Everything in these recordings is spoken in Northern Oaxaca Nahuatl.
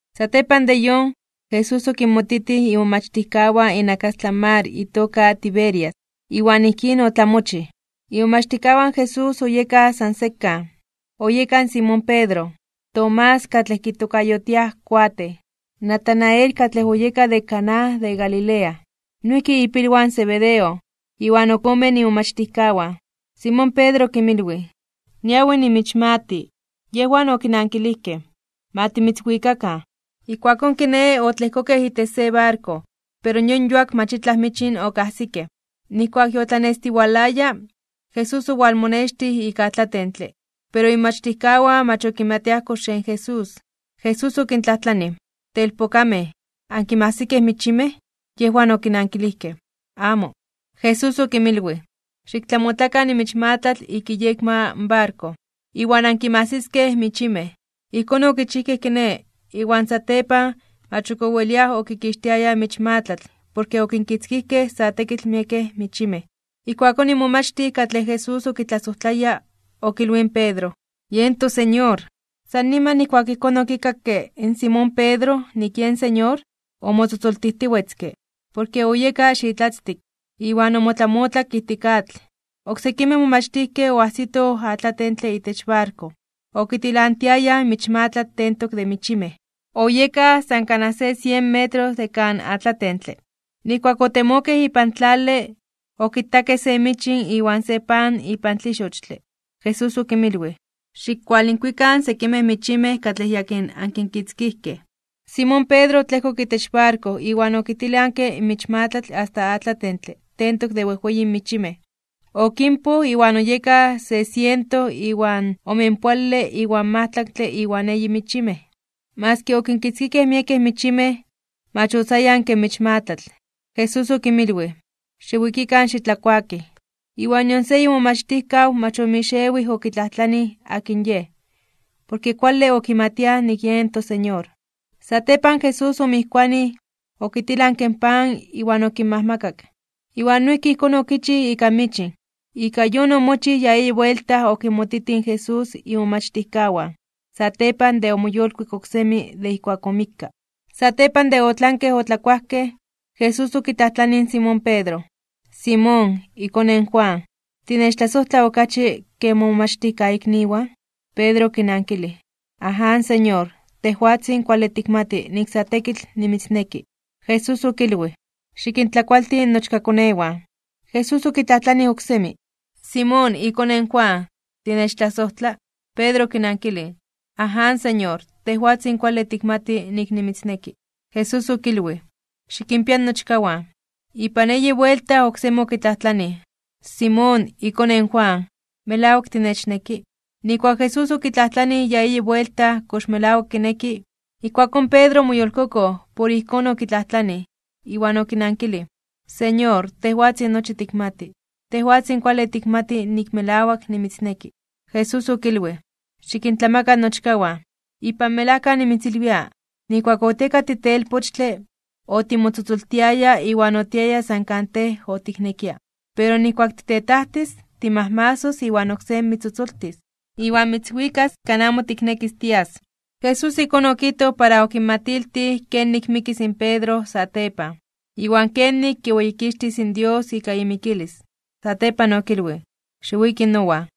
Satepan de yon, Jesús okinmotitij imomachtijkawan inakastlan mar itoka Tiberias. Iwan ijkín otlamochij: Imomachtijkawan Jesús oyekaj san sekan, oyeka in Simón Pedro, Tomás katlej kitokayotiaj Kuatej, Natanael katlej oyeka de Caná de Galilea, noijki ipilwan Zebedeo, iwan ok omen imomachtijkawan. Simón Pedro okinmilwij: ―Niawi nimichmati. Yejwan okinankilijkej: ―Ma timitzwikakan. Ijkuakón kiné, otlejkokej itech se barko. Pero yon yuak mach itlaj michin okajsikej. Nijkuak yotlanestiwalaya, Jesús owalmonextij ik atlatentle, pero imomachtijkawan mach okimatiaj kox yen Jesús. Jesús okintlajtlanij: ―Telpokamej, ¿ankinmajsikej michimej? Yejwan okinankilijkej: ―¡Amo! Jesús okinmilwij: ―Xiktlamotlakan in michmatlatl ik iyekma in barko, iwan ankinmajsiskej michimej. Ijkón okichijkej kiné, iwan satepan, mach ok oweliaj okikixtiayaj in michmatlatl porke okinkitzkijkej sa tekitl miekej michimej. Ijkuakón in momachtij katlej Jesús okitlasojtlaya, okilwij in Pedro: ―¡Yen toSeñor! San niman nijkuak ijkón okikakke in Simón Pedro nik yen Señor, omotzotzoltijtiwetzke, porke oyeka xitlatztik, iwan omotlamotlak ijtik atl. Oksekimej momachtijkej oajsitoj atlatentle itech barko, okitilantiayaj in michmatlatl tentok de michimej. Oyekaj san kanaj se sien metros de kan atlatentle. Nijkuak otemokej ipan tlale, okitakej se michin iwan se pan ipan tlixochtle. Jesús okinmilwij: ―Xikkualinkuikan sekimej michimej katlej yakin ankinkitzkijkej. Simón Pedro otlejkok itech barko iwan okitilanke in michmatlatl asta atlatentle tentok de wejweyin michimej. Okinpoj, iwan oyekaj se siento iwan omenpoale iwan majtlaktle iwan eyi michimej. Maski okinkitzkijkej miekej michimej, mach otzayanke in michmatlatl. Jesús okinmilwij: ―Xiwikikan xitlakuakij. Iwan nion se imomachtijkaw mach omixewij okitlajtlanij akin Yej, porke kuale okimatiaj nik yen toSeñor. Satepan Jesús omijkuanij, okitilanke in pan iwan okinmajmakak. Iwan noijki ijkón okichij ika michin. Ika yon omochij ya eyi buelta okinmotitij in Jesús imomachtijkawan, satepan de omoyolkuik oksemi de ijkuak omikka. Satepan de otlanke otlakuajkej, in Jesús okitlajtlanij in Simón Pedro: ―Simón, ikone in Jonás, ¿tinechtlasojtla okachi ke momomachtijkaikniwan? Pedro okinankilij: ―Aján, Señor, tejwatzin kuale tikmati nik sa tekitl nimitzneki. Jesús okilwij: ―Xikintlakualti nochkakonewan. Jesús okitlajtlanij oksemi: ―Simón, ikone in Jonás, ¿tinechtlasojtla? Pedro okinankilij: ―Aján, Señor, tejwatzin kuale tikmati nik nimitzneki. Jesús okilwij: ―Xikinpia nochkawan. Ipan eyi buelta oksemi okitlajtlanij: ―Simón, ikone in Jonás, ¿melawak tinechneki? Nijkuak in Jesús okitlajtlanij ya eyi buelta kox melawak kineki, ijkuakón Pedro omoyolkokoj por ijkón okitlajtlanij. Iwan okinankilij: ―Señor, tejwatzin nochi tikmati. Tejwatzin kuale tikmati nik melawak nimitzneki. Jesús okilwij: ―Xikintlamaka nochkawan. Ipan melajka nimitzilwia, nijkuak otieka titelpochtle, otimotzotzoltiaya iwan otiaya san kan tej otiknekia. Pero nijkuak titetajtis, timajmasos iwan oksé mitztzotzoltis, iwan mitzwikas kan amo tiknekis tias. Jesús ijkón okijtoj para okinmatiltij kenik mikis in Pedro satepan, iwan kenik kiweyikixtis in Dios ika imikilis. Satepan okilwij: ―Xiwiki nowan.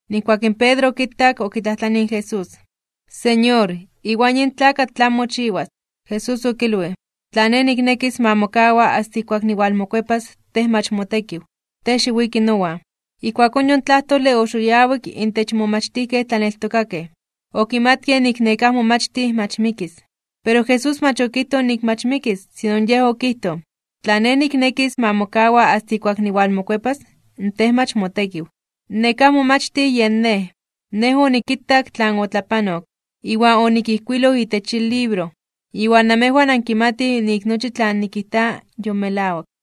Nijkuak in Pedro okitak, okitlajtlanij in Jesús: ―Señor, ¿iwan yin tlakatl tlan mochiwas? Jesús okilwij: ―Tla Nej niknekis ma mokawa asta ijkuak niwalmokuepas, tej mach motekiw. Tej xiwiki nowan. Ijkuakón yon tlajtole oxoyawik (oxitinki) intech in momachtijkej tlaneltokakej, okimatkej nik nekáj momachtij mach mikis. Pero Jesús mach okijtoj nik mach mikis. Sino Yej okijtoj: “Tla Nej niknekis ma mokawa asta ijkuak niwalmokuepas, tej mach motekiw.” Nekáj momachtij yen nej. Nej onikitak tlan otlapanok, iwan onikijkuiloj itech yin libro. Iwan namejwan ankimatij nik nochi tlan nikijta yon melawak.